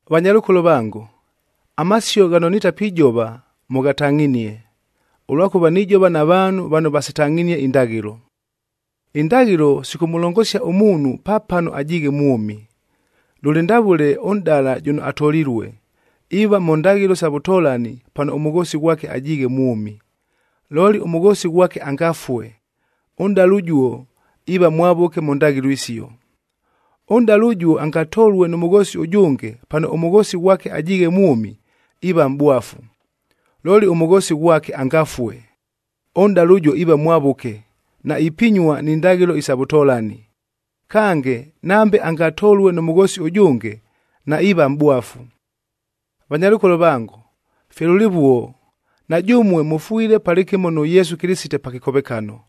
Vanyalʉkolo vango, amasio ghano nitapijova mʉghatangʼhinie, ʉlwakʉva nijova na vaanhu vano vasitangʼhinie indaghɨlo. Indaghɨlo sikʉmʉlongosia ʉmuunhu pa pano ajiighe mwʉmi. Lʉlɨ ndavʉle ʉnʼdala jʉno atolilue, iiva mʉ ndaghɨlo sa vʉtolani pano ʉmʉghoosi ghwake ajiighe mwʉmi. Looli ʉmʉghoosi ghwake angafue, ʉnʼdala ʉjuo iiva mwavʉke mʉ ndaghɨlo isio. Ʉnʼdala ʉjuo angatolue nʉ mʉghoosi ʉjʉnge pano ʉmʉghoosi ghwake ajiighe mwʉmi, iiva mʼbwafu. Looli ʉmʉghoosi ghwake angafue, ʉnʼdala ʉjuo iiva mwavʉke, naipinyua ni ndaghɨlo isa vʉtolani. Kange, nambe angatolue nʉ mʉghoosi ʉjʉnge, naiiva mʼbwafu. Vanyalʉkolo vango, fye lʉlɨvuo, na jʉmue mʉfwile palɨkɨmo nʉ Yesu Kɨlɨsite pa kɨkovekano,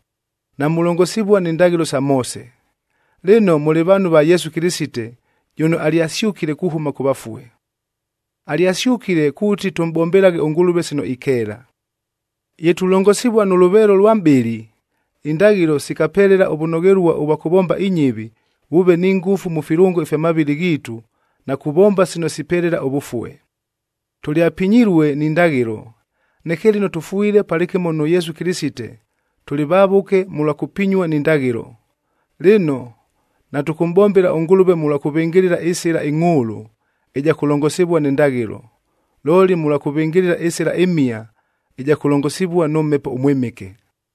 namulongosivua ni ndaghɨlo sa Moose. Lɨno, mʉlɨ vaanhu va Yesu Kɨlɨsite jʉno alyasyʉkile kuhʉma kʉ vafue. Alyasyʉkile kuuti tʉmʼbombelaghe ʉNgʉlʉve sino ikeela. Ye tulongosivua nʉ lʉveelo lwa mʼbɨlɨ, indaghɨlo sikapelela ʉvʉnoghelua ʉvwa kʉvomba inyɨvi, vʉʉve ni ngʉfu mʉ filʉngo ifya mavɨlɨ ghiitu na kuvomba sino sipelela ʉvʉfue. Tʉlyapinyilue ni ndaghɨlo, neke lɨno tʉfwile palɨkɨmo nʉ Yesu Kɨlɨsite, tʉlɨ vavʉke mʉlwa kʉpinyua ni ndaghɨlo. Lɨno, natʉkʉmʼbombela ʉNgʉlʉve mʉlwa kʉvɨngɨlɨla ɨsɨla ɨngʼhʉʉlʉ ɨja kʉlongosivua ni ndaghɨlo, looli mʉlwa kʉvɨngɨlɨla ɨsɨla ɨmhia ɨja kʉlongosivua nʉ Mhepo ʉMwɨmɨke.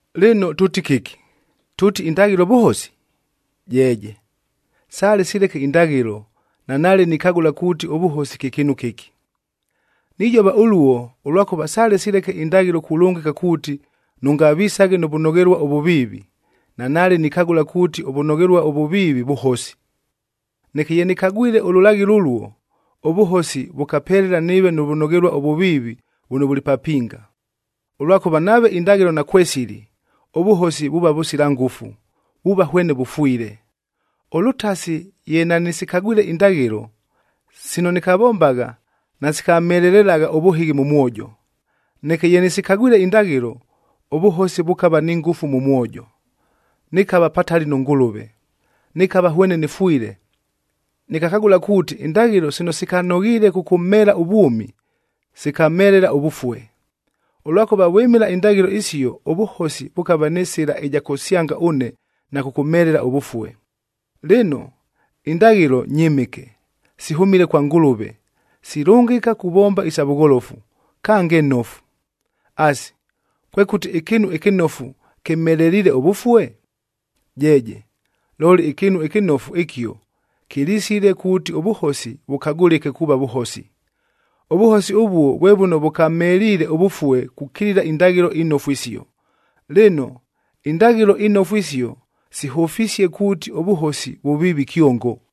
Lɨno tʉʉti kɨki? Tʉʉti indaghɨlo vʉhosi? Jeeje, sale sileke indaghɨlo, nanaale nikagʉla kuuti ʉvʉhosi kye kɨɨnu kɨki. Nijova ʉluo, ʉlwakʉva sale sileke indaghɨlo kulʉngɨka kuuti, “Nʉngavisaghe nʉ vʉnoghelua ʉvʉviivi,” a nanaale nikagʉla kuuti ʉvʉnoghelua ʉvʉviivi, vʉhosi. Neke ye nɨkagwile ʉlʉlaghɨlo ʉluo, ʉvʉhosi vʉkapelela nɨɨve nʉ vʉnoghelua ʉvʉviivi vʉno vʉlɨ papinga, ʉlwakʉva nave indaghɨlo nakwesili, ʉvʉhosi vuuva vʉsila ngʉfu, vuuva hwene vʉfwile. Ʉlʉtasi ye nanɨsikagwile indaghɨlo, sino nɨkavombagha nasikamhelelagha ʉvʉhɨghi mʉ mwojo. Neke ye nɨsikagwile indaghɨlo, ʉvʉhosi vʉkava ni ngʉfu mʉ mwojo, nɨkava patali nʉ Ngʉlʉve, nɨkava hwene nɨfwile. Nɨkakagʉla kuuti, indaghɨlo sino sikanoghiile kʉkʉmheela ʉvwʉmi, sikamhelela ʉvʉfue. Ʉlwakʉva vwɨmɨla indaghɨlo isio ʉvʉhosi vʉkava nɨ sɨla ɨja kʉsyanga ʉne na kʉkʉmhelela ʉvʉfue. Lɨno, indaghɨlo nyɨmɨke, sihʉmile kwa Ngʉlʉve, silʉngɨka kuvomba isa vʉgholofu, kange nofu. Asi, kwekʉti ɨkɨɨnu ɨkɨnofu kɨmheleliile ʉvʉfue? Jeeje, looli ɨkɨɨnu ɨkɨnofu ɨkio kɨlisile kuuti ʉvʉhosi vʉkagʉlɨke kuuva vʉhosi. Ʉvʉhosi ʉvuo vwe vʉno vʉkamheliile ʉvʉfue kukilila indaghɨlo inofu isio. Lɨno, indaghɨlo inofu isio, sihʉfisie kuuti ʉvʉhosi vʉviivi kyongo.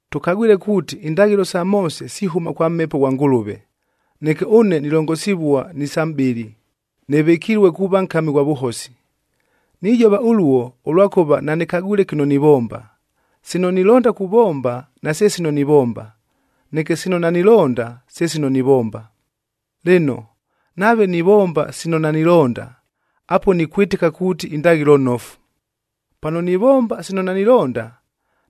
Tʉkagwile kuuti, indaghɨlo sa Moose sihʉma kwa Mhepo ghwa Ngʉlʉve, neke ʉne nilongosivua ni sa mʼbɨlɨ, nɨvɨkilue kuuva nkami ghwa vʉhosi. Nijova ʉluo, ʉlwakʉva nanɨkagwile kɨno nivomba! Sino nilonda kuvomba, nase sino nivomba, neke sino nanilonda, se sino nivomba. Lɨno, nave nivomba sino nanilonda, apuo nikwɨtɨka kuuti indaghɨlo nofu. Pano nivomba sino nanilonda,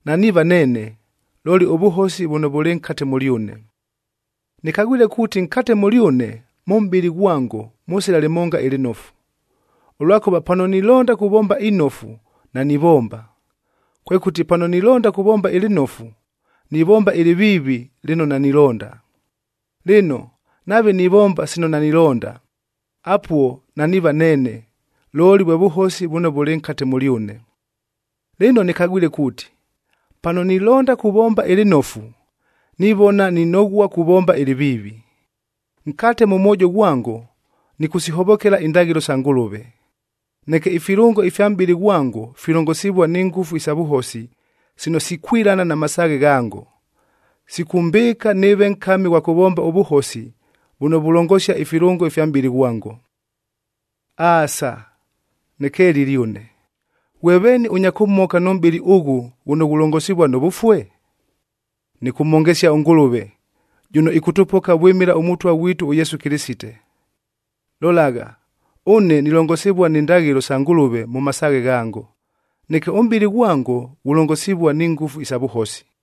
naniiva neene, looli vʉhosi vʉno vʉlɨ nkate mʉlyʉne. Nɨkagwile kuuti nkate mʉlyʉne, mʉ mʼbɨlɨ ghwango mʉsila lɨmonga ɨlɨnofu, ʉlwakʉva pano nilonda kuvomba inofu, nanivomba. Kwekʉti, pano nilonda kuvomba ɨlɨnofu, nivomba ɨlɨviivi lɨno nanilonda. Lɨno, nave nivomba sino nanilonda, apuo naniiva neene, looli vwe vʉhosi vʉno vʉlɨ nkate mʉlyʉne. Lɨno nɨkagwile kuuti, pano nilonda kuvomba ɨlɨnofu, nivona ninoghua kuvomba ɨlɨviivi. Nkate mʉ mwojo ghwango nɨkʉsihovokela indaghɨlo sa Ngʉlʉve. Neke ifilʉngo ifya mʼbɨlɨ ghwango filongosivua ni ngʉfu isa vʉhosi sino sikwilana na masaaghe ghango, sikʉmbɨɨka nɨɨve nkami ghwa kʉvomba ʉvʉhosi vʉno vulongosia ifilʉngo ifya mʼbɨlɨ ghwango. Aasa! Nɨkelile ʉne, ghwe veeni ʉnya kʉmhoka nʉ mʼbɨlɨ ʉghʉ ghʉno ghulongosivua nʉ vʉfue? Nɨkʉmhongesia ʉNgʉlʉve jʉno ɨkʉtʉpoka vwɨmɨla ʉMʉtwa ghwitu ʉYesu Kɨlɨsite. Lolagha, ʉne nilongosivua ni ndaghɨlo sa Ngʉlʉve mʉ masaaghe ghango, neke ʉmʼbɨlɨ ghwango ghulongosivua ni ngʉfu isa vʉhosi.